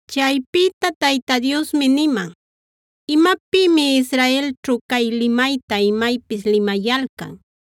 Chaypïta Tayta Diosmi niman: “¿Imapïmi Israelćhu cay limayta imaypis limayalcan: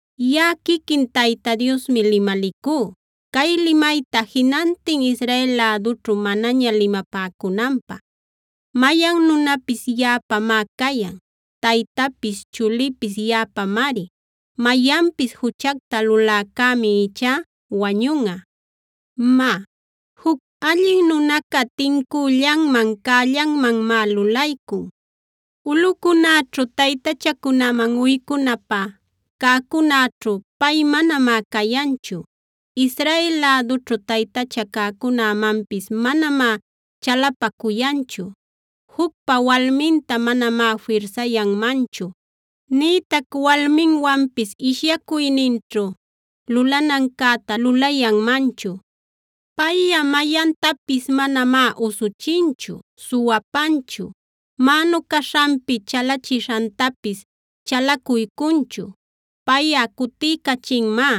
“Yaꞌa quiquin Tayta Diosmi limalicú, cay limayta jinantin Israel lädućhu manaña limapäcunanpä. Mayan nunapis yaꞌapamá cayan; taytapis chulipis yaꞌapamari. Mayanpis juchacta luläcämi ichá wañunꞌa. “Má, juc allin nunaca tincüllanman, cällanmanmá lulaycun. Ulꞌucunäćhu taytachacunaman uycunapä cäcunäćhu, pay manamá cayanchu. Israel lädućhu taytacha cäcunämanpis manamá chalapacuyanchu. Jucpa walminta manamá firsayanmanchu, nïtac walminwanpis ishyacuyninćhu lulanancäta lulayanmanchu. Payꞌa mayantapis manamá usuchinchu, suwapanchu, mänu caśhanpi chalachishantapis chalacuycunchu. Payꞌa cutiycachinmá,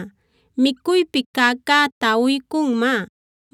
micuypi cäcäta uycunmá,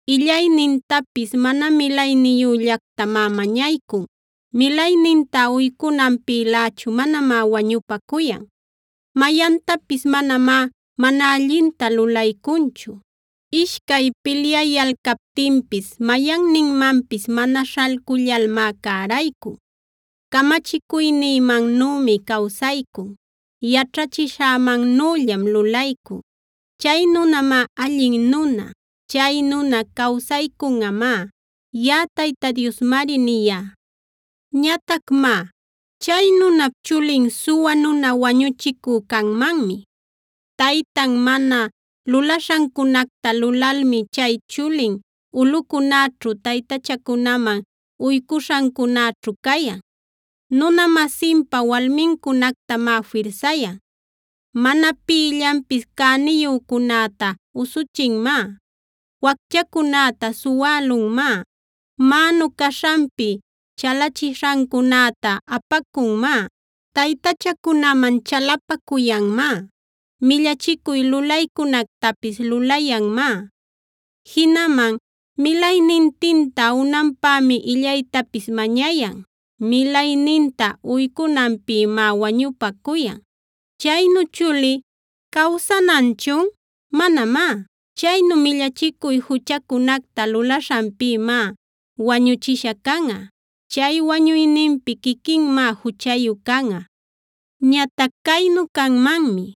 Illaynintapis mana milayniyüllactamá mañaycun, milayninta uycunanpïlächu manamá wañupacuyan. Mayantapis manamá mana allinta lulaycunchu; ishcay pilyayalcaptinpis mayanninmanpis mana śhalcullalmá cäraycun. Camachicuynïmannümi cawsaycun; yaćhachishämannüllam lulaycun. Chay nunamá allin nuna; chay nuna cawsaycunꞌamá.c Yaꞌa Tayta Diosmari niyá. “Ñatac má, chay nunap chulin suwa nuna wañuchicü canmanmi. Taytan mana lulaśhancunacta lulalmi chay chulin ulꞌucunäćhu, taytachacunaman uycuśhancunäćhu cayan, nuna-masinpa walmincunactamá firsayan, mana pïllanpis cäniyücunäta usuchinmá, wacchacunäta suwälunmá, mänu caśhanpi chalachishancunäta apacunmá, taytachacunaman chalapacuyanmá, millachicuy lulaycunactapis lulayanmá. Jinaman milaynintinta unanpämi illaytapis mañayan, milayninta uycunanpïmá wañupacuyan. “Chaynu chuli, ¿cawsananchun? ¡Manamá! Chaynu millachicuy juchacunacta lulaśhanpïmá wañuchisha canꞌa. Chay wañuyninpi quiquinmá juchayu canꞌa. “Ñatac caynu canmanmi;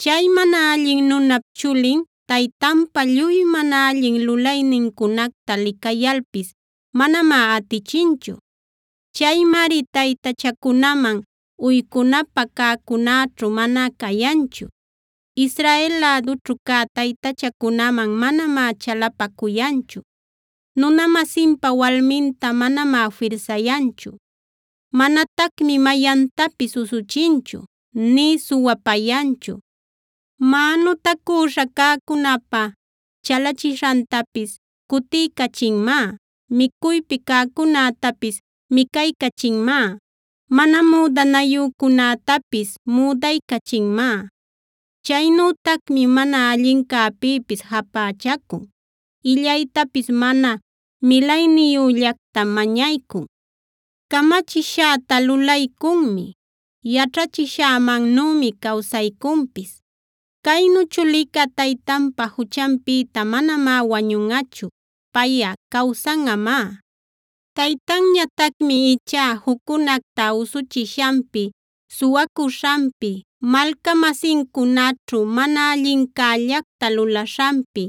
chay mana allin nunap chulin, taytanpa lluy mana allin lulaynincunacta licayalpis manamá atichinchu. Chaymari taytachacunaman uycunapä cäcunäćhu mana cayanchu, Israel lädućhu cä taytachacunaman manamá chalapacuyanchu, nuna-masinpa walminta manamá firsayanchu. Manatacmi mayantapis usuchinchu, nï suwapayanchu; mänutacüśha cäcunäpa chalachishantapis cutiycachinmá, micuypi cäcunätapis micaycachinmá, mana müdanayücunätapis müdaycachinmá. Chaynütacmi mana allincäpïpis japächacun, illaytapis mana milayniyüllactam mañaycun, camachishäta lulaycunmi, yaćhachishämannümi cawsaycunpis. “Caynu chulica taytanpa juchanpïta manamá wañunꞌachu. Payꞌa cawsanꞌamá. Taytanñatacmi ichá juccunacta usuchishanpi, suwacuśhanpi, malca-masincunaćhu mana allincällacta lulaśhanpi,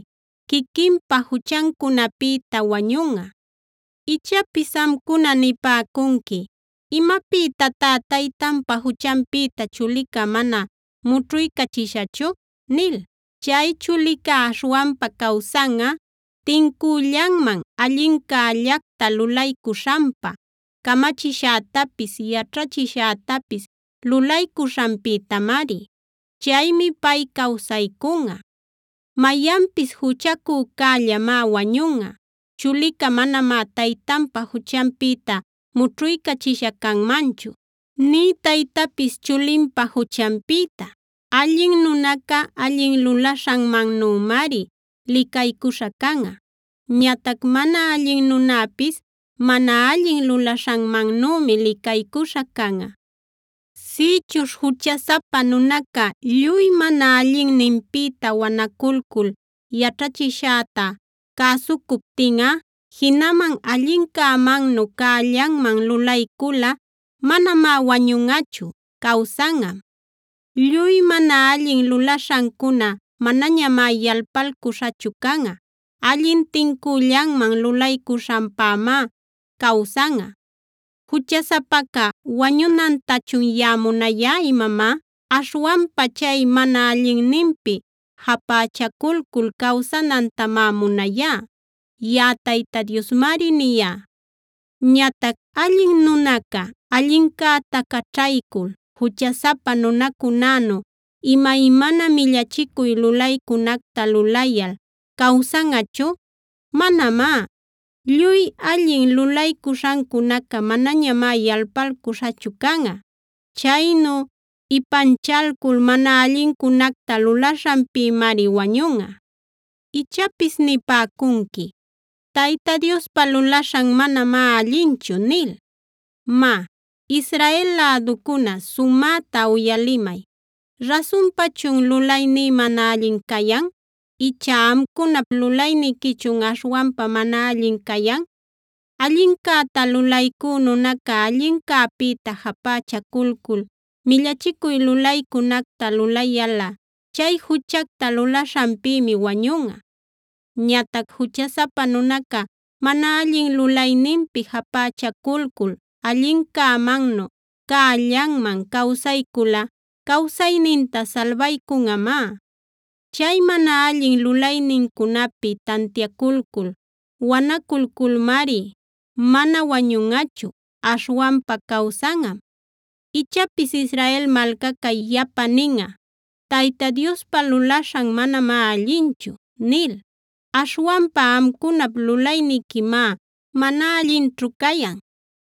quiquinpa juchancunapïta wañunꞌa. “Ichapis amcuna nipäcunqui: ‘¿Imapïtatá taytanpa juchanpïta chulica mana mućhuycachishachu?’ nil. Chay chulica aśhwanpa cawsanꞌa tincüllanman, allincällacta lulaycuśhanpa, camachishätapis yaćhachishätapis lulaycuśhanpïtamari. Chaymi pay cawsaycunꞌa. Mayanpis juchacücällamá wañunꞌa. Chulica manamá taytanpa juchanpïta mućhuycachisha canmanchu, nï taytapis chulinpa juchanpïta.d Allin nunaca allin lulaśhanmannümari licaycuśha canꞌa. Ñatac mana allin nunäpis mana allin lulaśhanmannümi licaycuśha canꞌa. “Sïchuśh juchasapa nunaca lluy mana allinninpïta wanaculcul yaćhachishäta cäsucuptinꞌa, jinaman allincämannu cällanman lulayculꞌa manamá wañunꞌachu; cawsanꞌam. Lluy mana allin lulaśhancuna manañamá yalpalcuśhachu canꞌa; allin tincüllanman lulaycuśhanpamá cawsanꞌa. ¿Juchasapaca wañunantachun yaꞌa munayá imamá? Aśhwanpa chay mana allinninpi japächaculcul cawsanantamá munayá.e Yaꞌa Tayta Diosmari niyá. “Ñatac allin nunaca allincäta caćhaycul juchasapa nunacunänu imaymana millachicuy lulaycunacta lulayal ¿cawsanꞌachun? Manamá. Lluy allin lulaycuśhancunaca manañamá yalpalcuśhachu canꞌa. Chaynu ipanchalcul mana allincunacta lulaśhanpïmari wañunꞌa. “Ichapis nipäcunqui: ‘Tayta Diospa lulaśhan manamá allinchu’ nil. Má, Israel läducuna sumäta uyalimay: ¿Rasunpachun lulayní mana allin cayan? ¿Icha amcunap lulayniquichun aśhwanpa mana allin cayan? Allincäta lulaycü nunaca allincäpïta japächaculcul millachicuy lulaycunacta lulayalꞌa, chay juchacta lulaśhanpïmi wañunꞌa. Ñatac juchasapa nunaca mana allin lulayninpi japächaculcul allincämannu cällanman cawsayculꞌa cawsayninta salbaycunꞌamá. Chay mana allin lulaynincunapi tantiaculcul wanaculmari mana wañunꞌachu; aśhwanpa cawsanꞌam. Ichapis Israel malcaca yapa ninꞌa: ‘Tayta Diospa lulaśhan manamá allinchu’ nil. Aśhwanpa amcunap lulayniquimá mana allinćhu cayan.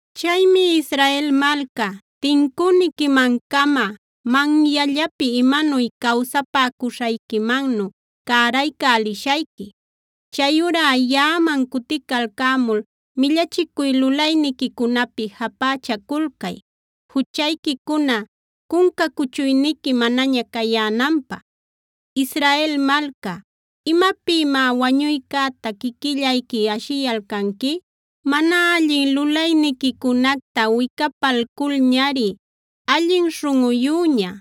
“Chaymi Israel malca, tincüniquiman-cama manyallapi imanuy cawsapäcuśhayquimannu cäraycälishayqui.f Chayurá yaꞌaman cuticalcämul millachicuy lulayniquicunapi japächaculcay, juchayquicuna cunca cuchuyniqui manaña cayänanpä. Israel malca, ¿imapïmá wañuycäta quiquillayqui ashiyalcanqui? Mana allin lulayniquicunacta wicapalculñari allin śhunꞌuyüña,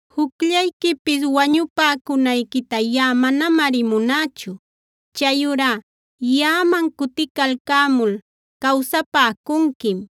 Jucllayquipis wañupäcunayquita yaꞌa manamari munächu. Chayurá yaꞌaman cuticalcämul cawsapäcunquim.